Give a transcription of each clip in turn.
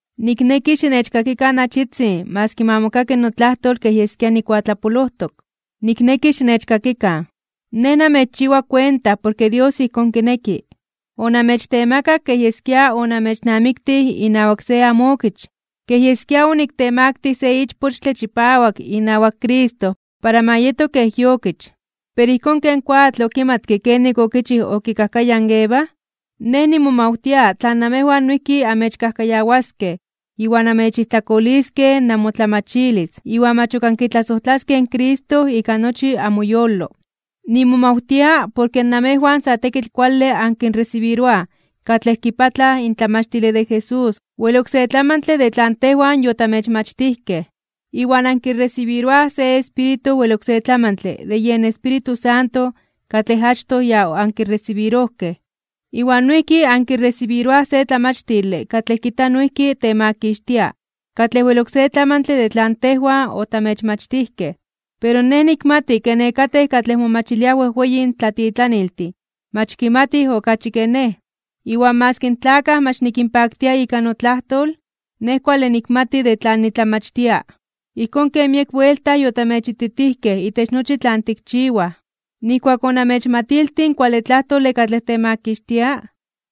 Nikneki xinechkakikan achitzin maski ma mokaki notlajtol kej yeskia nikuatlapolojtok. Nikneki xinechxikokan. Nej namechchiwa kuenta porke Dios ijkón kineki. Onamechtemakak kej yeskia onamechnamiktij inawak se amookich, kej yeskia oniktemaktij (oniktemaktilij) se ichpochtle chipawak inawak Cristo para ma yeto kej iokich. Pero ijkón ken koatl okimatke kenik okichij okikajkayaj in Eva, nej nimomawtia tla namejwan noijki amechkajkayawaskej iwan amechijtlakoliskej namotlamachilis, iwan mach ok ankitlasojtlaskej in Cristo ika nochi amoyolo. Nimomawtia porke namejwan sa tekitl kuale ankinresibiroaj katlej kipatlaj in tlamachtile de Jesús wel oksé tlamantle de tlan tejwan yotamechmachtijkej. Iwan ankiresibiroaj se espíritu wel oksé tlamantle de yen Espíritu Santo katlej achtoj ya ankiresibirojkej, iwan noijki ankiresibiroaj se tlamachtile katlej kijta noijki temakixtia katlej wel oksé tlamantle de tlan tejwan otamechmachtijkej. Pero nej nikmati ke nekatej katlej momachiliaj wejweyin tlatitlaniltin mach kimatij okachi ke nej. Iwan maski in tlakaj mach nikinpaktia ika notlajtol, nej kuale nikmati de tlan nitlamachtia, ijkón ken miek buelta yotamechititijkej itech nochi tlan tikchiwaj. Nijkuak onamechmatiltij in kuale tlajtole katlej temakixtia,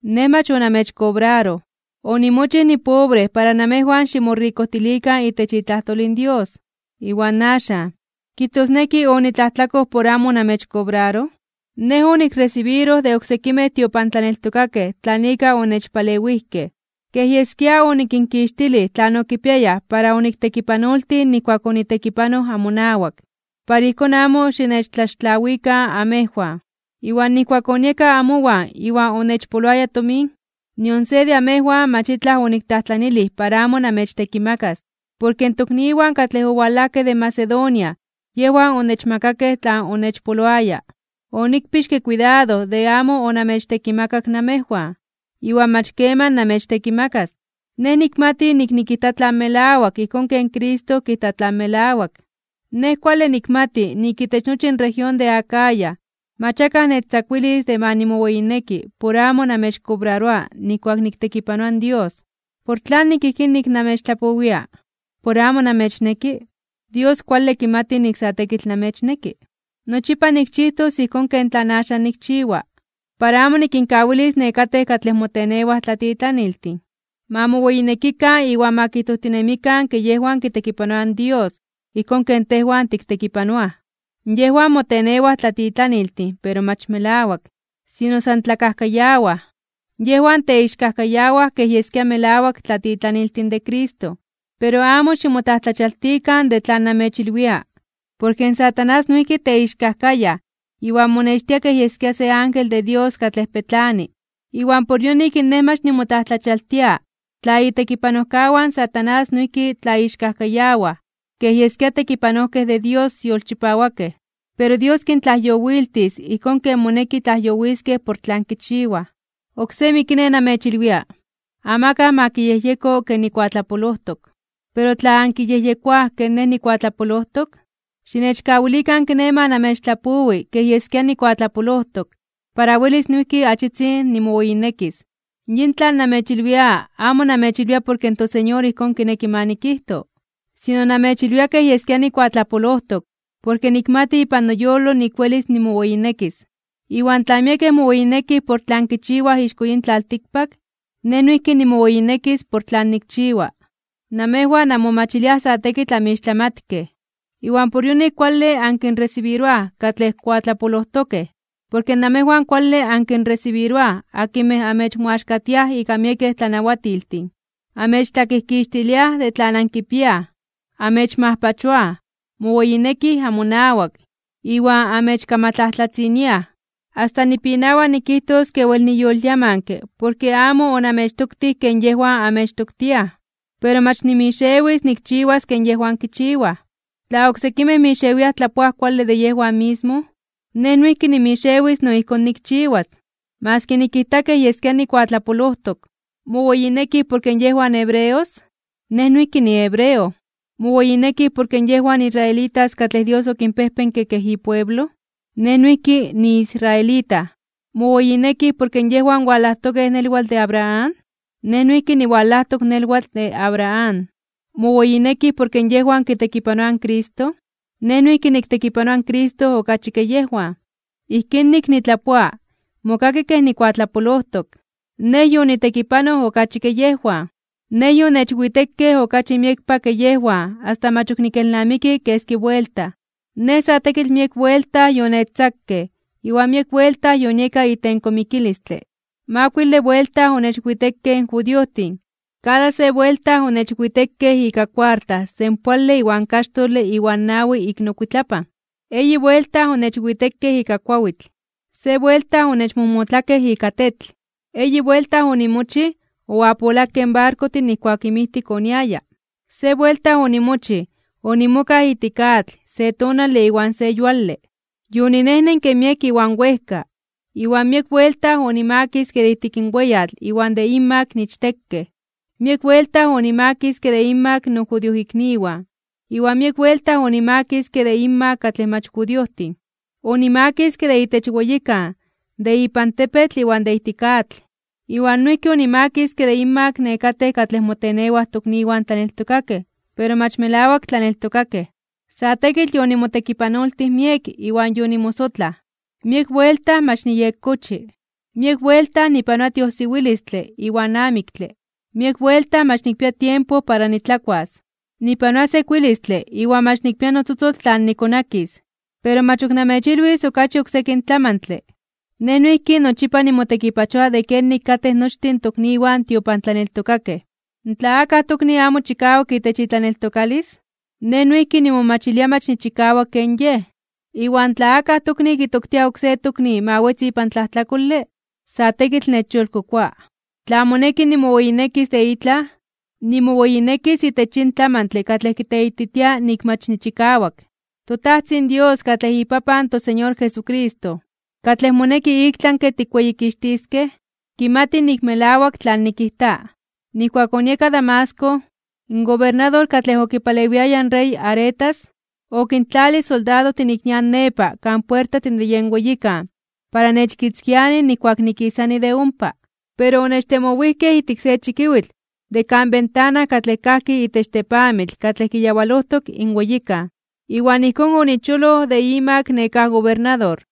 nej mach onamechkobraroj. Onimochij nipobre para namejwan ximorikojtilikan itech itlajtol in Dios. Iwan axan, ¿kijtosneki onitlajtlakoj por amo onamechkobraroj? Nej onikresibiroj de oksekimej tiopantlaneltokakej tlan ika onechpalewijkej, kej yeskia onikinkixtilij tlan okipiayaj para oniktekipanoltij nijkuak onitekipanoj amonawak, para ijkón amo xinechtlaxtlawikan amejwan. Iwan nijkuak onieka amowan iwan onechpoloaya tomin, nion se de amejwan mach itlaj oniktlajtlanilij para amo namechtekimakas, porke in tokniwan katlej owalajkej de Macedonia yejwan onechmakakej tlan onechpoloaya. Onikpixke kuidado de amo onamechtekimakak namejwan, iwan mach keman namechtekimakas. Nej nikmati nik nikijta tlan melawak ijkón ken Cristo kijta tlan melawak. Nej kuale nikmati nik itech nochi in región de Acaya mach akaj nechtzakuilis de ma nimoweyineki por amo namechkobraroa nijkuak niktekipanoa in Dios. ¿Por tlanik ijkín nik namechtlapowia? ¿Por amo namechneki? Dios kuale kimati nik sa tekitl namechneki. Nochipa nikchijtos ijkón ken tlan axan nikchiwa, para amo nikinkawilis nekatej katlej motenewaj tlatitlaniltin, ma moweyinekikan iwan ma kijtojtinemikan ke yejwan kitekipanoaj in Dios ijkón ken tejwan tiktekipanoaj. Yejwan motenewaj tlatitlaniltin pero mach melawak, sino san tlakajkayawaj. Yejwan teixkajkayawaj kej yeskia melawak tlatitlaniltin de Cristo. Pero amo ximotlajtlachialtikan (ximomajmawtikan) de tlan namechilwia, porke in Satanás noijki teixkajkayaj iwan monextia kej yeskia se ángel de Dios katlej petlani. Iwan por yonik nej mach nimotlajtlachialtia (nimomajmawtia) tla itekipanojkawan in Satanás noijki tlaixkajkayawaj kej yeskia tekipanojkej de Dios yolchipawakej. Pero Dios kintlajyowiltis ijkón ken moneki tlajyowiskej por tlan kichiwaj. Oksemi kiné, namechilwia: amakaj ma kiyejyeko ke nikuatlapolojtok. Pero tla ankiyejyekoaj ke nej nikuatlapolojtok, xinechkawilikan kiné ma namechtlapowi kej yeskia nikuatlapolojtok para welis noijki achitzin nimoweyinekis. Yin tlan nemechilwia amo namechilwia porke in toSeñor ijkón kineki ma nikijto, sino namechilwia kej yeskia nikuatlapolojtok porke nikmati ipan noyolo nik welis nimoweyinekis. Iwan tla miekej moweyinekij por tlan kichiwaj ixko yin tlaltikpak, nej noijki nimoweyinekis por tlan nikchiwa. Namejwan anmomachiliaj sa tekitl amixtlamatkej, iwan por yonik kuale ankinresibiroaj katlej kuatlapolojtokej. Porke namejwan kuale ankinresibiroaj akinmej amechmoaxkatiaj ika miekej tlanawatiltin, amechtlakijkixtiliaj de tlan ankipiaj, amechmajpachoaj, moweyinekij amonawak, iwan amechkamatlajtlatziniaj. Asta nipinawa nikijtos ke wel niyolyamanke porke amo onamechtoktij ken yejwan amechtoktiaj. Pero mach nimixewis nikchiwas ken yejwan kichiwaj. Tla oksekimej mixewiaj tlapoaj kuale de yejwan mismo, nej noijki nimixewis no ijkón nikchiwas, maski nikijta kej yeskia nikuatlapolojtok. ¿Moweyinekij porke yejwan hebreos? Nej noijki nihebreo. ¿Moweyinekij porke yejwan israelitas katlej Dios okinpejpenke kej ipueblo? Nej noijki niisraelita. ¿Moweyinekij porke yejwan walajtokej nelwatl de Abraham? Nej noijki niwalajtok nelwatl de Abraham. ¿Moweyinekij porke yejwan kitekipanoaj in Cristo? Nej noijki niktekipanoa in Cristo okachi ke yejwan. Ijkín nik nitlapoa, mokaki kej nikuatlapolojtok. Nej yonitekipanoj okachi ke yejwan. Nej yonechwitekej okachi miekpa ke yejwan asta mach ok nikelnamiki keski buelta. Nej sa tekitl miek buelta yonechtzakej iwan miek buelta yonieka itenko (itempan) mikilistle. Makuile buelta onechwitekej in judiojtin, kada se buelta onechwitekej ika kuarta senpoale iwan kaxtole iwan nawi ik nokuitlapan. Eyi buelta onechwitekej ika kuawitl. Se buelta onechmojmotlakej ika tetl. Eyi buelta onimochij, oapolakej in barkojtin nijkuak inmijtik oniaya. Se buelta onimochij, onimokaj ijtik atl, se tonale iwan se yuale. Yoninejnenke miek iwan wejka, iwan miek buelta onimakiske de ijtik weyatl iwan de inmak ichtekej. Miek buelta onimakiske de inmak nojudiojikniwan iwan miek buelta onimakiske de inmak katlej mach judiojtin. Onimakiske de itech weyikan, de ipan tepetl iwan de ijtik atl. Iwan noijki onimakiske de inmak nekatej katlej motenewaj tokniwan tlaneltokakej pero mach melawak tlaneltokakej. Sa tekitl yonimotekipanoltij miek iwan yonimosotlaj. Miek buelta mach niyekkochi. Miek buelta nipanoa tiojsiwilistle iwan amiktle. Miek buelta mach nikpia tiempo para nitlakuas. Nipanoa sekuilistle iwan mach nikpia notzotzol tlan nikonakis. Pero mach ok namechilwis okachi oksekin tlamantle. Nej noijki nochipa nimotekipachoa de kenik katej nochtin in tokniwan tiopantlaneltokakej. Tla akaj tokni amo chikawak itech itlaneltokalis, nej noijki nimomachilia mach nichikawak ken yej. Iwan tla akaj tokni kitoktia oksé tokni ma wetzi ipan tlajtlakole, sa tekitl nechyolkokoa. Tla moneki nimoweyinekis de itlaj, nimoweyinekis itech yin tlamantle katlej kiteititia nik mach nichikawak. ToTajtzin Dios katlej iPapan in toSeñor Jesucristo, katlej moneki iktlanke (ik tlami) tikweyikixtiskej, kimati nik melawak tlan nikijta. Nijkuak onieka Damasco, in gobernador katlej okipalewiaya in rey Aretas, okintlalij soldadojtin ik nian nepa kan puertajtin de yen weyikan para nechkitzkianij nijkuak nikisani de ompa. Pero onechtemowijkej ijtik se chikiwitl de kan ventana katlej kajki itech tepamitl katlej kiyawalojtok in weyikan. Iwan ijkón onicholoj de imak nekáj gobernador.